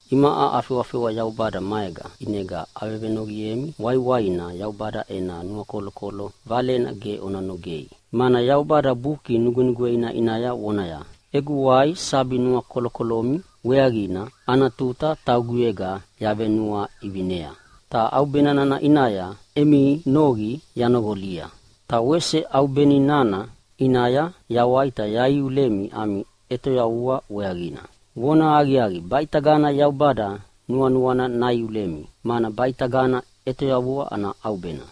Imaʼa afewafewa Yaubada maega, ʼinega avevenoqiemi waiwaina Yaubada ena nuakolokolo valena ge ona nogei. Mana Yaubada Buki Nugwenugweina ʼinaya vonaya, “Egu wai sabi nuakolokolomi weaqina ana tuta tauguyega yavenuaʼivinea, ta ʼaubena nana ʼinaya emi noqi yanoqolia. Ta wese ʼaubeni nana ʼinaya yawai ta yaiulemi ami ʼetoyavua weaqina.” Vonahaqiaqi, baʼitagana Yaubada nuanuana naiulemi, mana baʼitagana ʼetoyavua ana ʼaubena!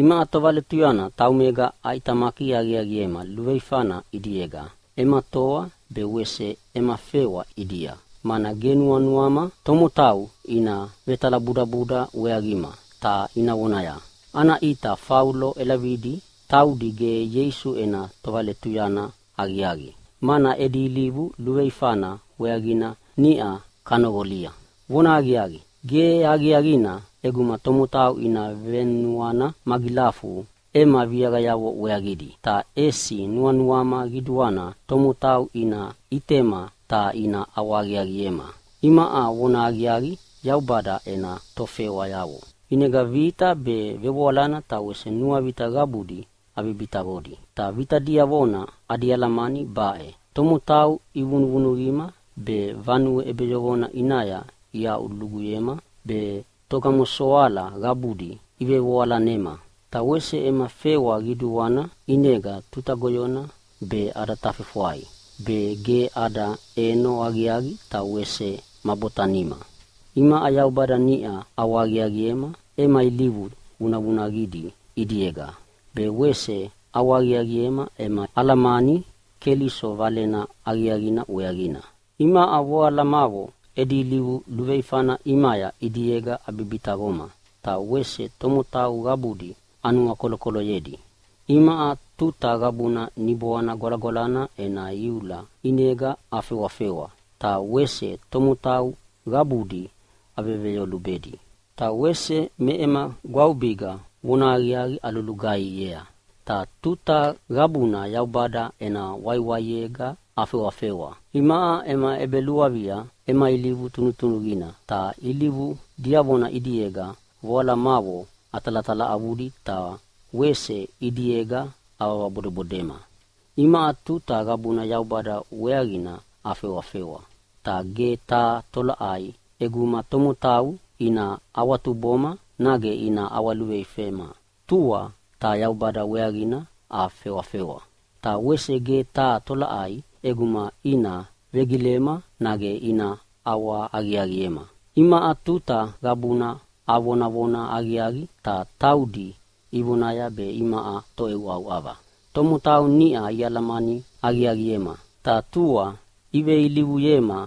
Imaʼa tovaletuyana taumega aʼitamaki aqiaqiema luveifana ʼidiega ema toa be wese ema fewa ʼidia. Mana ge nuanuama tomotau ina vetalabudabuda weaqima ta ina vonaya, “Ana ʼita Faulo ʼelavidi taudi gebu Ieisu ena tovaletuyana aqiaqi, mana edi ilivu luveifana weaqina niʼa kanoqolia.” Vonahaqiaqi, ge aqiaqina ʼeguma tomotau ina venuana magilafu ema viaqayavo weaqidi. Ta ʼesi nuanuama qiduana tomotau ina ʼitema ta ina ʼawahaqiaqiema imaʼa vonahaqiaqi Yaubada ena tofewayavo. ʼInega vita be, vevoalana ta wese nuavita qabudi abibitaqodi. Ta vita diavona adi alamani baʼe: Tomotau ivunuvunuqima be, vanue ʼebeyoqona ʼinaya iaʼuaʼuluguyema be, togamosoala qabudi ivevevoalanema. Ta wese ema fewa qiduana ʼinega tuta goyona be ada tafefwai be, ge ada ʼeno aqiaqi ta wese ma botanima. Imaʼa Yaubada niʼa ʼawahaqiaqiema ema ilivu vunavunaqidi ʼidiega, be wese ʼawahaqiaqiema ema alamani Keliso Valena Aqiaqina weaqina. Imaʼa voalamavo edi ilivu luveifana ʼimaya ʼidiega abibitaqoma, ta wese tomotau qabudi anuakolokoloyedi. Imaʼa tuta qabuna Niboana Gwalagwalana ena iula ʼinega afewafewa, ta wese tomotau qabudi aveveyolubedi. Ta wese me ema gwavubiga vonahaqiaqi alulugaihiea. Ta tuta qabuna Yaubada ena waiwai ʼinega afewafewa. Imaʼa ema ʼebeluavia ema ilivu tunutunuqina, ta ilivu diavona ʼidiega voalamavo atalatalaʼavudi ta wese ʼidiega avabodebodema. Imaʼa tuta qabuna Yaubada weaqina afewafewa. Ta ge taha tolaʼai ʼeguma tomotau ina awatuboma nage ina ʼawaluveifema, tua ta Yaubada weaqina afewafewa. Ta wese ge taha tolaʼai ʼeguma ina vegilema nage ina ʼawahaqiaqiema. Imaʼa tuta qabuna avonavona aqiaqi, ta taudi ivonaya be imaʼa toʼeuʼauʼava. Tomotau niʼa ialamani aqiaqiema, ta tua iveilivuyema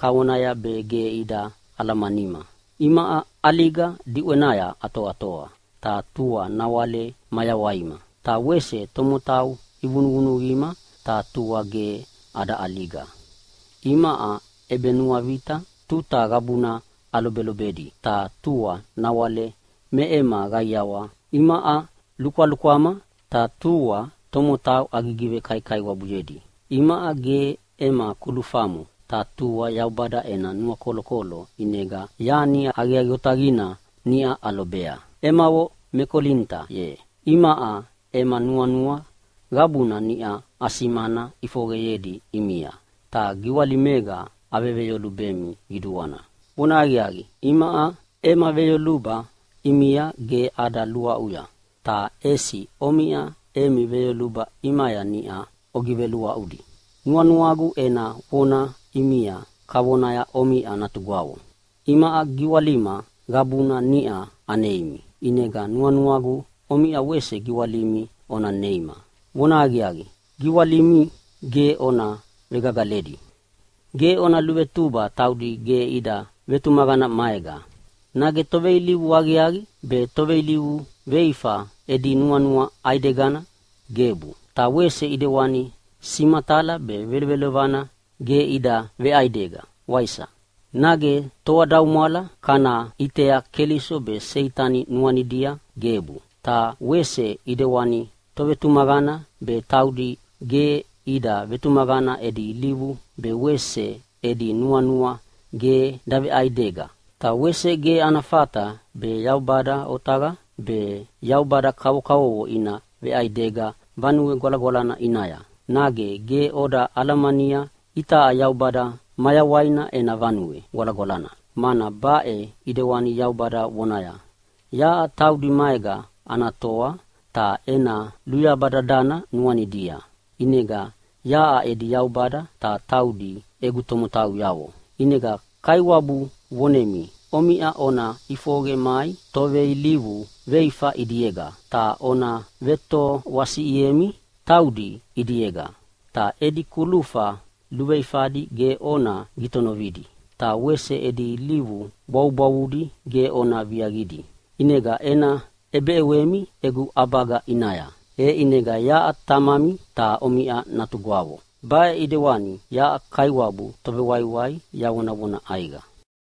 kavona be ge ida alamanima. Imaʼa ʼaliga diʼwenaya atoatoa, ta tua nawale mayawaima. Ta wese tomotau ivunuvunuqima ta tua ge ada ʼaliga. Imaʼa ʼebenuavita tuta qabuna alobelobedi, ta tua nawale me ema qaiawa. Imaʼa lukwalukwama, ta tua tomotau agivekaikaiwabuyedi. Imaʼa ge ema kulufamo, ta tua Yaubada ena nuakolokolo ʼinega yani aqiaqi otaqina niʼa alobea. Emavo me Kolinita ye, imaʼa ema nuanua qabuna niʼa asimana ʼifoqeyedi ʼimia, ta giwalimega aveveyolubemi qiduana. Vonahaqiaqi, imaʼa ema veyoluba ʼimia ge ada luaʼuya, ta ʼesi omiʼa emi veyoluba ʼimaya niʼa ogiveluaʼudi. Nuanuagu ena vona ʼimia kavona omiʼa natugwavo. Imaʼa giwalima qabuna niʼa aneimi, ʼinega nuanuagu omiʼa wese giwalimi ona neima. Vonahaqiaqi, giwalimi ge ona vegagaledi! Ge ona luvetuba taudi ge ida vetumaqana maega. Nage toveilivu aqiaqi be toveilivu veifa edi nuanua ʼaidegana? Gebu! Ta wese ʼidewani simatala be velovelovana ge ida veʼaidega, waisa? Nage toadaumwala kana ʼitea Keliso be Seitani nuanidia? Gebu! Ta wese ʼidewani tovetumaqana be taudi ge ida vetumaqana edi ilivu be wese edi nuanua ge daveʼaidega. Ta wese ge ana fata be Yaubada otaqa be yaubada kavokavovo ina veʼaidega Vanue Gwalagwalana ʼinaya. Nage ge oda alamania itaʼa Yaubada mayawaina ena vanue gwalagwalana? Mana baʼe ʼidewani Yaubada vonaya, “Yaʼa taudi maega ana toa, ta ena luyaba dadana nuanidia. ʼInega yaʼa edi Yaubada, ta taudi egu tomotauyavo. ʼInega Kaiwabu vonemi omiʼa ona ʼifoqe mai toveilivu veifa ʼidiega ta ona vetoasiʼiemi taudi ʼidiega. Ta edi kulufa luveifadi ge ona gitonovidi, ta wese edi ilivu bwavubwavuna ge ona viaqidi. ʼInega ena ʼebeʼewemi egu ʼabaga ʼinaya. E ʼinega yaʼa Tamami, ta omiʼa natugwavo. Baʼe ʼidewani yaʼa Kaiwabu Tovewaiwai yavonavona ʼaiqa.”